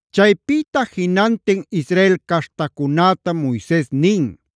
Chaypïta jinantin Israel caśhtacunätam Moises nin: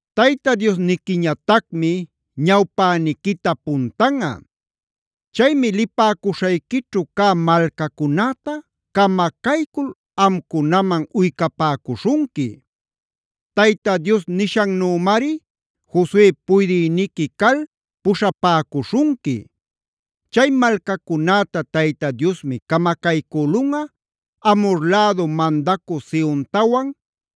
Tayta Diosniquiñatacmi ñawpäniquita puntanꞌa. Chaymi lipäcuśhayquićhu cä malcacunäta camacaycul amcunaman uycapäcuśhunqui. Tayta Dios nishannümari Josue puydïniqui calmi puśhapäcuśhunqui. Chay malcacunäta Tayta Diosmi camacaycülunꞌa Amhor lädu mandacü Sehontawan,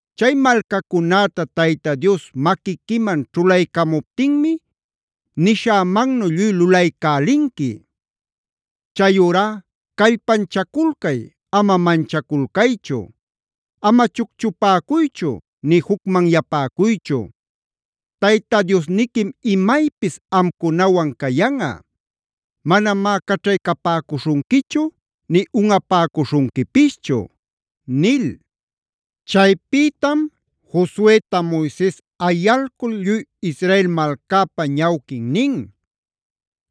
Chay malcacunäta Tayta Dios maquiquiman ćhulaycamuptinmi nishämannu lluy lulaycälinqui. Chayurá ¡callpanchaculcay, ama manchaculcaychu! Ama chucchupäcuychu nï jucmanyapäcuychu. Tayta Diosniquim imaypis amcunawan cayanꞌa; manamá caćhaycapäcuśhunquichu, nï unꞌapäcuśhunquipischu” nil. Chaypïtam Josueta Moises ayalcul lluy Israel malcäpä ñawquin nin: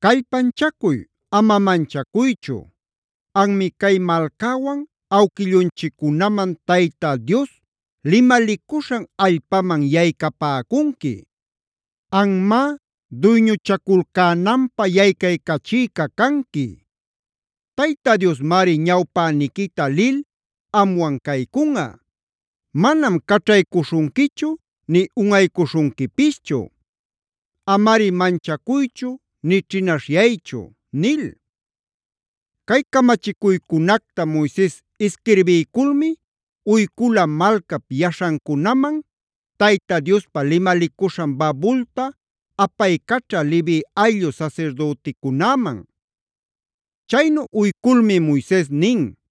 “¡Callpanchacuy, ama manchacuychu! Anmi cay malcäwan awquillunchiccunaman Tayta Dios limalicuśhan allpaman yaycapäcunqui. Anmá duyñuchaculcänanpä yaycaycachïca canqui. Tayta Diosmari ñawpäniquita lil amwan caycunꞌa. Manam caćhaycuśhunquichu nï unꞌaycuśhunquipischu.c Amari manchacuychu nï ćhinaśhyaychu” nil. Cay camachicuycunacta Moises isquirbiyculmi uycula malcap yaśhancunaman, Tayta Diospa limalicuśhan babulta apaycaćha Levi ayllu sasirdüticunäman. Chaynu uyculmi Moises nin: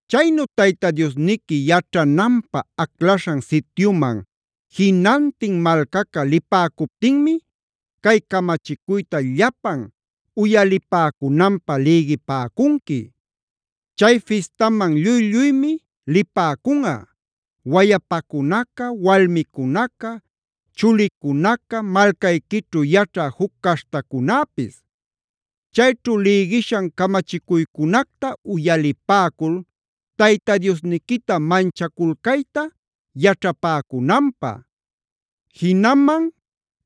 Chaynu Tayta Diosniqui yaćhananpä aclaśhan sityuman jinantin malcaca lipäcuptinmi cay camachicuyta llapan uyalipäcunanpä lïgipäcunqui.f Chay fistaman lluy-lluymi lipäcunꞌa: wayapacunaca, walmicunaca, chulicunaca, malcayquićhu yaćhä juc caśhtacunäpis. Chayćhu lïgishan camachicuycunacta uyalipäcul Tayta Diosniquita manchaculcayta yaćhapäcunanpä; jinaman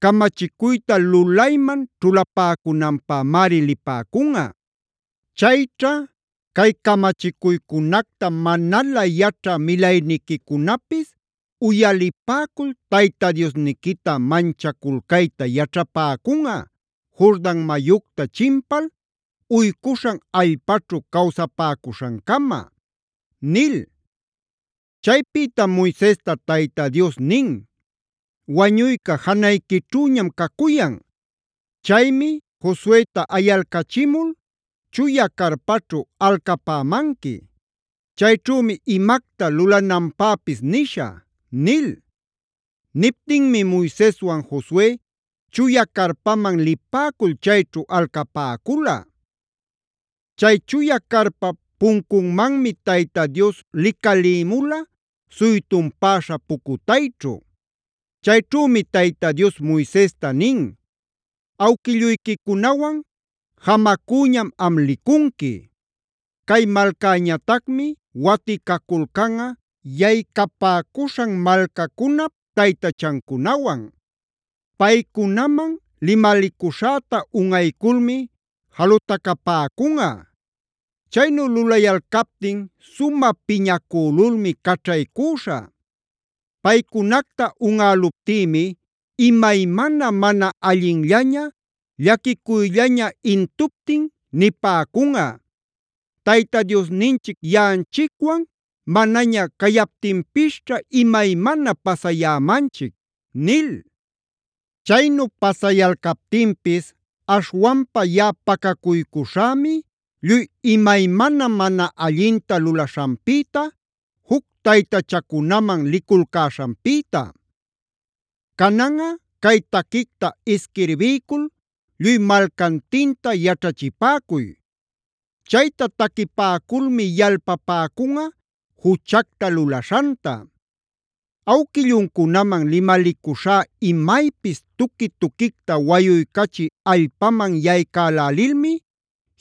camachicuyta lulayman ćhulapäcunanpämari lipäcunꞌa. Chayćha cay camachicuycunacta manalä yaćhä milayniquicunapis uyalipäcul Tayta Diosniquita manchaculcayta yaćhapäcunꞌa, Jordan mayucta chimpal uycuśhan allpaćhu cawsapäcuśhancama” nil. Chaypïtam Moisesta Tayta Dios nin: “Wañuyca janayquićhüñam cacuyan. Chaymi Josueta ayalcachimul chuya carpaćhu alcapämanqui. Chayćhümi imacta lulananpäpis nishä” nil. Niptinmi Moiseswan Josue chuya carpaman lipäcul chayćhu alcapäcula. Chay chuya carpap puncunmanmi Tayta Dios licalïmula suytunpäśha pucutayćhu. Chayćhümi Tayta Dios Moisesta nin: “Awquilluyquicunawan jamacüñam am licunqui. Cay malcäñatacmi waticaculcanꞌa yaycapäcuśhan malcacunap taytachancunawan. Paycunaman limalicuśhäta unꞌayculmi jalutacapäcunꞌa. Chaynu lulayalcaptin sumä piñacülulmi caćhaycüśhä. Paycunacta unꞌäluptïmi imaymana mana allinllaña, llaquicuyllaña intuptin nipäcunꞌa: ‘Tayta Diosninchic yaꞌanchicwan manaña cayaptinpisćha imaymana pasayämanchic’ nil. Chaynu pasayalcaptinpis aśhwanpa yaꞌa pacacuycuśhämi lluy imaymana mana allinta lulaśhanpïta, juc taytachacunaman liculcäśhanpïta. “Cananꞌa cay taquicta isquirbiycul lluy malcantinta yaćhachipäcuy. Chayta taquipäculmi yalpapäcunꞌa juchacta lulaśhanta. Awquilluncunaman limalicuśhá imaypis tuqui-tuquicta wayuycachï allpaman yaycälälilmi;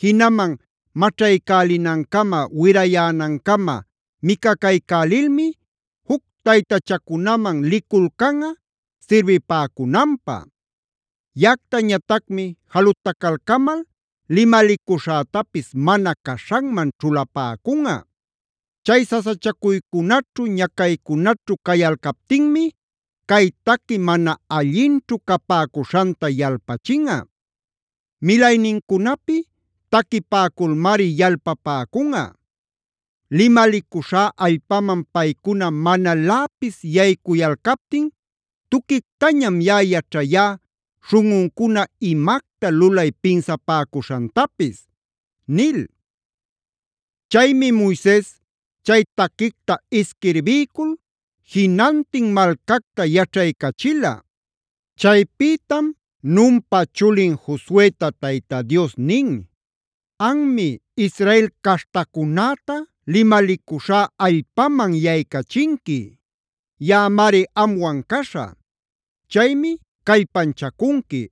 jinaman maćhaycälinancama, wirayänancama micacaycälilmi juc taytachacunaman liculcanꞌa sirbipäcunanpä. Yaꞌactañatacmi jalutacalcamal limalicuśhätapis mana caśhanman ćhulapäcunꞌa. Chay sasachacuycunaćhu, ñacaycunaćhu cayalcaptinmi cay taqui mana allinćhu capäcuśhanta yalpachinꞌa. Milaynincunapi taquipäculmari yalpapäcunꞌa. Limalicuśhá allpaman paycuna manaläpis yaycuyalcaptin tuquictañam yaꞌa yaćhayá śhunꞌuncuna imacta lulay pinsapäcuśhantapis” nil. Chaymi Moises chay taquicta isquirbiycul jinantin malcacta yaćhaycachila. Chaypïtam Nunpa chulin Josueta Tayta Dios nin:g “Anmi Israel caśhtacunäta limalicuśhá allpaman yaycachinqui. Yaꞌamari amwan caśhä. Chaymi callpanchacunqui,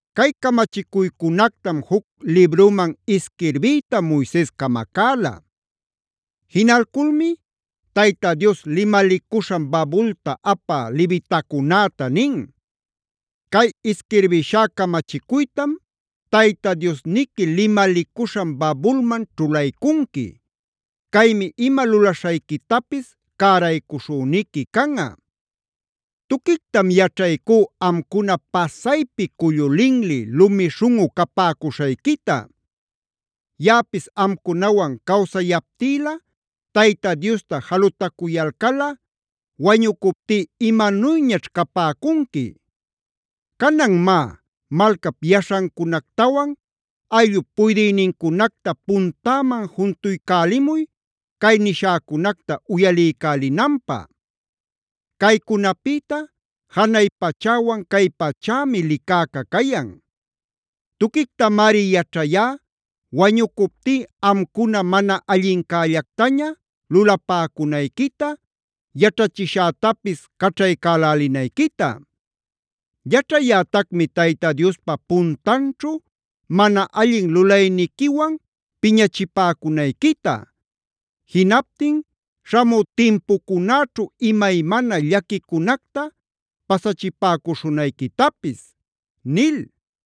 Cay camachicuycunactam juc libruman isquirbiyta Moises camacäla. Jinalculmi Tayta Dios limalicuśhan babulta apä levitacunäta nin: “Cay isquirbishá camachicuytam Tayta Diosniqui limalicuśhan babulman ćhulaycunqui. Caymi ima lulaśhayquitapis cäraycuśhüniqui canꞌa. Tuquictam yaćhaycú amcuna pasaypi cullu linli, lumi śhunꞌu capäcuśhayquita. Yaꞌapis amcunawan cawsayaptïlä Tayta Diosta jalutacuyalcalꞌa, ¡wañucuptí imanuyñaćh capäcunqui! Canan má, malcap yaśhancunactawan ayllup puydïnincunacta puntäman juntuycälimuy cay nishäcunacta uyaliycälinanpä. Caycunapïta janay pachäwan cay pachämi licäca cayan. Tuquictamari yaćhayá wañucuptí amcuna mana allincällactaña lulapäcunayquita, yaćhachishätapis caćhaycälälinayquita. Yaćhayätacmi Tayta Diospa puntanćhu mana allin lulayniquiwani piñachipäcunayquita; jinaptin śhamü timpucunäćhu imaymana llaquicunacta pasachipäcuśhunayquitapis” nil.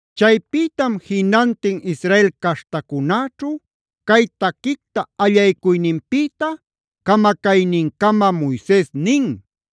Chaypïtam jinantin Israel caśhtacunäćhu cay taquicta allaycuyninpïta camacaynincama Moises nin: